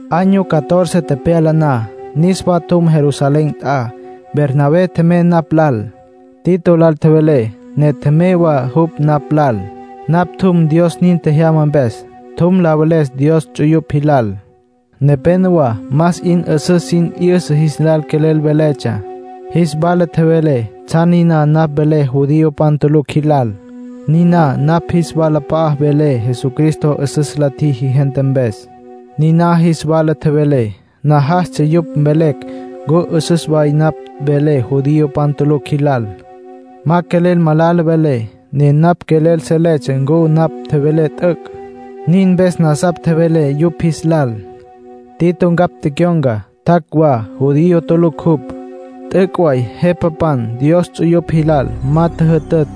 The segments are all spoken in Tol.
Año catorce tepyala na, niswa tjum Jerusalén nt'a. Bernabé tjemey napj lal. Tito lal tjevelé, ne tjemey wa jupj napj lal. Napj tjum Dios nin tjejyama mpes. Tjum la veles Dios ts'uyupj jilal; nepénowa más 'in 'üsüs sin 'yüsa jis lal quelel veletsja. Jis wala tjevelé tsjan niná napj velé judiopan tulucj jilal, niná napj jis walap'a'a velé Jesucristo 'üsüs la tjiji gente mpes. Niná jis wala tjevelé; najastsja yupj mvelecj ncu 'üsüs way napj velé judiopan tulucj jilal. Ma quelel malala velé, ne napj quelel seletsja ncu napj tjevelé t'üc'. Nin mpes nasapj tjevelé yupj jis lal. Tito ncapj tecyon̈ca, tjac' wa. Judío tulucj jupj. T'üc' way jepapan Dios ts'uyupj jilal ma tjüjütütj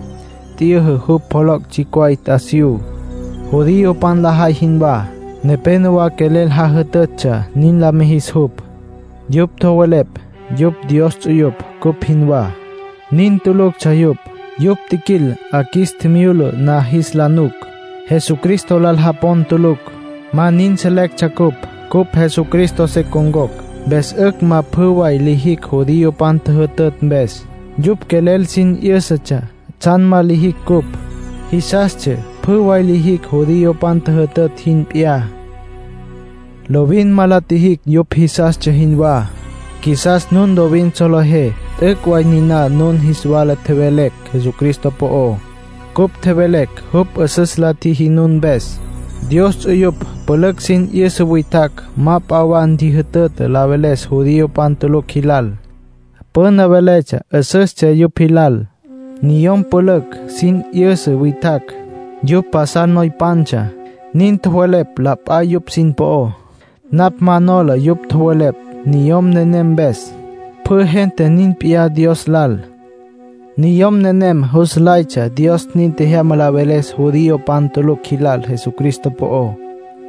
t'yüjü jupj pjoloc' tsjicj way t'asiyú, judiopan lajay jinwá. Nepénowa quelel jajütütsja nin la mijis jupj. Yupj tjowelepj yupj Dios ts'uyupj, cupj jinwá. Nin tuluctsja yupj. Yupj tjiquil 'a qjuis tjimyula na jis la nuc. Jesucristo lal japon tulucj. Ma nin selectsja cupj. Cupj Jesucristo se con̈cocj, mpes 'ücj ma pjü way lijicj judiopan tjüjütütj mpes. Yupj quelel sin 'yǘsatsja tsjan ma lijicj ncupj. Jisastsja pjü way lijicj judiopan tjüjütütj jin p'iyá. Lovin ma la tjijicj yupj jisastsja jinwá; qjuisas nun lovin solejé t'üc' way niná nun jis wala tjevelecj Jesucristo po'ó. Cupj tjevelecj jupj 'üsüs la tjiji nun mpes. Dios ts'uyupj pülücj sin 'yüsa witjacj ma p'a wa ntjijütütj la veles judiopan tulucj jilal. Püna veletsja 'üsüstsja yupj jilal. Niyom pülücj sin 'yüsa witjacj, yupj pasal noypantsja, nin tjowelepj la p'a yupj sin po'ó. Napj ma nola yupj tjowelepj niyom nenem mpes. Pjü gente nin p'iyá Dios lal. Niyom nenem jus nlaytsja Dios nin tjejyama la veles judiopan tulucj jilal Jesucristo po'ó.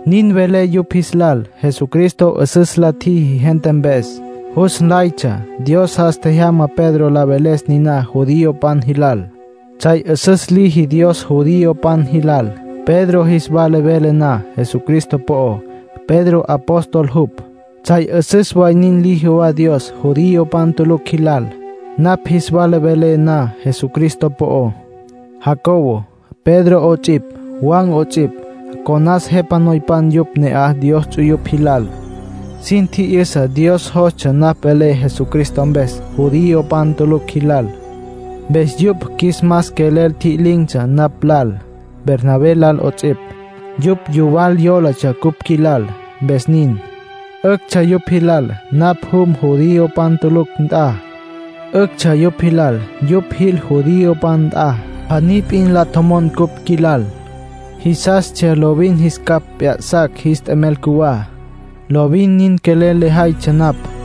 Nin velé yupj jis lal Jesucristo 'üsüs la tjiji gente mpes. Jus nlaytsja Dios jas tjejyama Pedro la veles niná judiopan jilal. Tsjay 'üsüs liji Dios judiopan jilal, Pedro jis wala vele na Jesucristo po'ó. Pedro apóstol jupj. Tsjay 'üsüs way nin liji wa Dios judiopan tulucj jilal, napj jis wala velé na Jesucristo po'ó. Jacobo, Pedro 'ots'ipj, Juan 'ots'ipj, conas jepa noypan yupj ne'aj Dios ts'uyupj jilal. Sin tji'yüsa Dios jostsja napj velé Jesucristo mpes judiopan tulucj jilal. Mpes yupj qjuis mas quelel tji'lin̈tsja napj lal, Bernabé lal 'ots'ipj. Yupj yuwal yólatsja cupj qjuilal, mpes nin. 'Üctsja yupj jilal napj jum judiopan tulucj nt'a. 'Üctsja yupj jilal yupj jil judiopan nt'a. Pjaní p'in la tjomon cupj qjuilal. Jisastsja lovin jis capj p'ya'sacj jis t'emel cjuwá. Lovin nin quelel lejaytsja napj.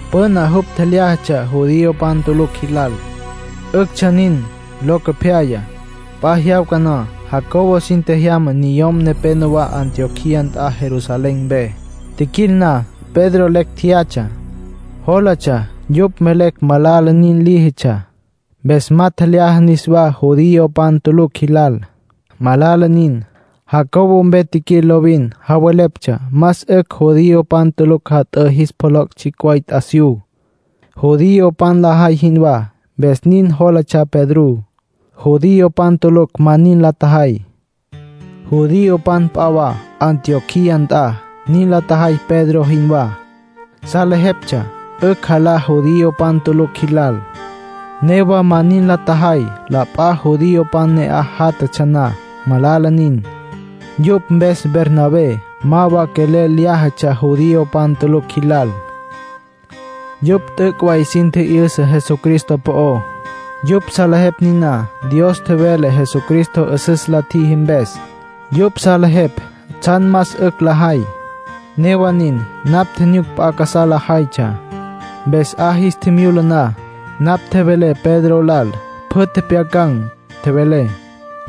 Püna jupj tjelyájatsja judiopan tulucj jilal. 'Üctsja nin. Locopyaya, p'a jyawca na, Jacobo sin tjejyama niyom nepenowá Antioquía nt'a Jerusalén mpe. Tjiquil na, Pedro lecj tjeyatsja. Jólatsja yupj mvelecj malala nin líjitsja, mpes ma tjelyaja niswá judiopan tulucj jilal. Malala nin. Jacobo mpe tjiquil lovin javeleptsja más 'ücj judiopan tulucj jat'ǘ jis pjoloc' tsjicj way t'asiyú, judiopan lajay jinwá, mpes nin jólatsja Pedrú. Judiopan tulucj ma nin la tjajay. Judiopan p'a wa Antioquía nt'a, nin la tjajay Pedro jinwá. Salejeptsja 'ücj jalá judiopan tulucj jilal, newa ma nin la tjajay la p'a judiopan ne'aj játjatsja na. Malala nin. Yupj mpes Bernabé ma wa quelel lyájatsja judiopan tulucj jilal. Yupj t'üc' way sin tji'yüsa Jesucristo po'ó. Yupj salejepj niná Dios tjevele Jesucristo 'üsüs la tjiji mpes. Yupj salejepj tsjan más 'ücj lajay. Newa nin, napj tjinyuc p'a casá lajaytsja. Mpes 'a jis tjimyula na, napj tjevelé Pedro lal. Pjü tjepjyacan̈. Tjevelé: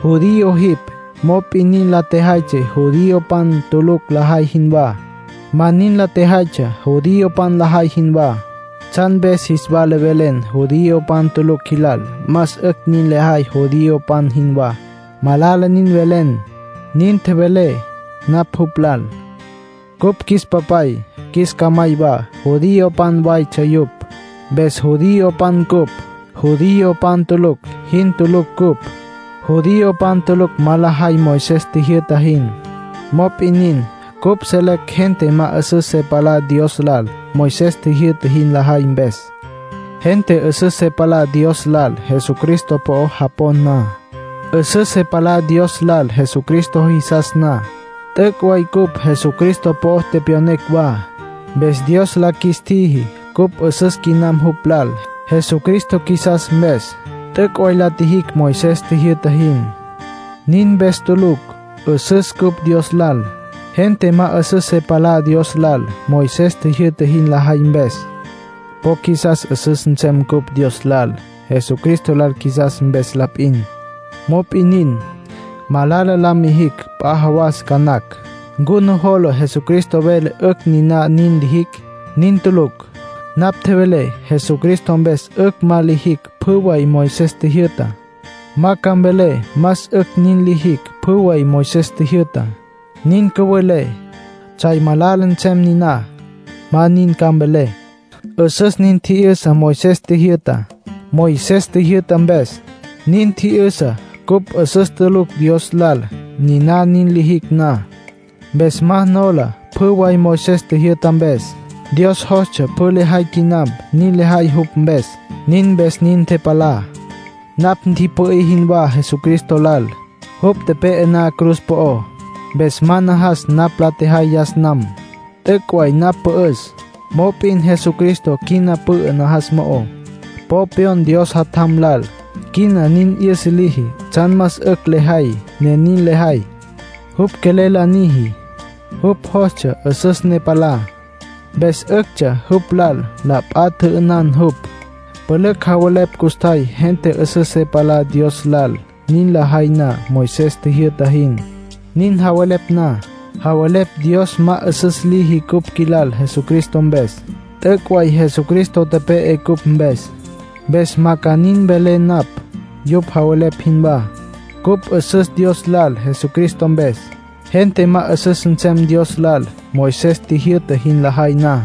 “Judío jipj, mop'in nin la tjejaytsja judiopan tulucj lajay jinwá. Ma nin la tjejaytsja judiopan lajay jinwá. ¿Tsjan mpes jis wala velen judiopan tulucj jilal más 'ücj nin lajay judiopan jinwá? Malala nin velen”, nin tjevelé napj jupj lal. Cupj qjuis papay, qjuis camay wa, judiopan waytsja yupj. Mpes judiopan cupj. Judiopan tulucj jin tulucj cupj. Judiopan tulucj ma lajay Moisés tjijyü'ta jin. Mop'in nin, cupj selecj gente ma 'üsüs se palá Dios lal Moisés tjijyü'ta jin lajay mpes. Gente 'üsüs se palá Dios lal Jesucristo po'o japon na. 'Üsüs se palá Dios lal Jesucristo jisas na. T'üc' way cupj Jesucristo po'o tepyonecj wa. Mpes Dios la qjuis tjiji cupj 'üsüs quinam jupj lal, Jesucristo qjuisas mpes. T'üc' way la tjijicj Moisés tjijyü'ta jin. Nin mpes tulucj, 'üsüs cupj Dios lal. Gente ma 'üsüs se palá Dios lal, Moisés tjijyü'ta jin lajay mpes. Po qjuisas 'üsüs nsem cupj Dios lal, Jesucristo lal qjuisas mpes la p'in. Mop'in nin, malala la mijicj p'a jawas ca nacj. ¿Ncu nujola Jesucristo vele 'ücj niná nin lijicj? ¡Nin tulucj! Napj tjevelé Jesucristo mpes 'ücj ma lijicj pjü way Moisés tjijyü'tá. Ma ca mvelé más 'ücj nin lijicj pjü way Moisés tjijyü'tá. Nin cüvelé, tsjay malala nsem niná. Ma nin ca mvelé. 'Üsüs nin tji'yüsa Moisés tjijyü'tá. Moisés tjijyü'ta mpes, nin tji'yüsa cupj 'üsüs tulucj Dios lal, niná nin lijicj na. Mpes ma nola pjü way Moisés tjijyü'ta mpes. Dios jostsja pjü lejay quinam nin lejay jupj mpes, nin mpes nin ntepalá. Napj ntipü'í jinwá Jesucristo lal, jupj tepe'e na cruz po'ó. Mpes ma najas napj la tjejay yas nam. T'üc' way napj pü'üs, mop'in Jesucristo quina pü'ü najas mo'ó. Po pyon Dios Jatjam lal. Quina nin 'yüsa liji tsjan más 'ücj lejay, ne nin lejay. Jupj quelel la niji. Jupj jostsja 'üsüs ne palá, mpes 'üctsja jupj lal la p'a tjü'ünan jupj. Pülücj javelepj custjay gente 'üsüs se palá Dios lal nin lajay na Moisés tjijyü'ta jin. Nin javelepj na, javelepj Dios ma 'üsüs liji cupj qjuilal Jesucristo mpes. T'üc' way Jesucristo tepe'e cupj mpes, mpes ma ca nin mvelé napj yupj javelepj jinwá. Cupj 'üsüs Dios lal Jesucristo mpes. Gente ma 'üsüs nsem Dios lal Moisés tjijyü'ta jin lajay na.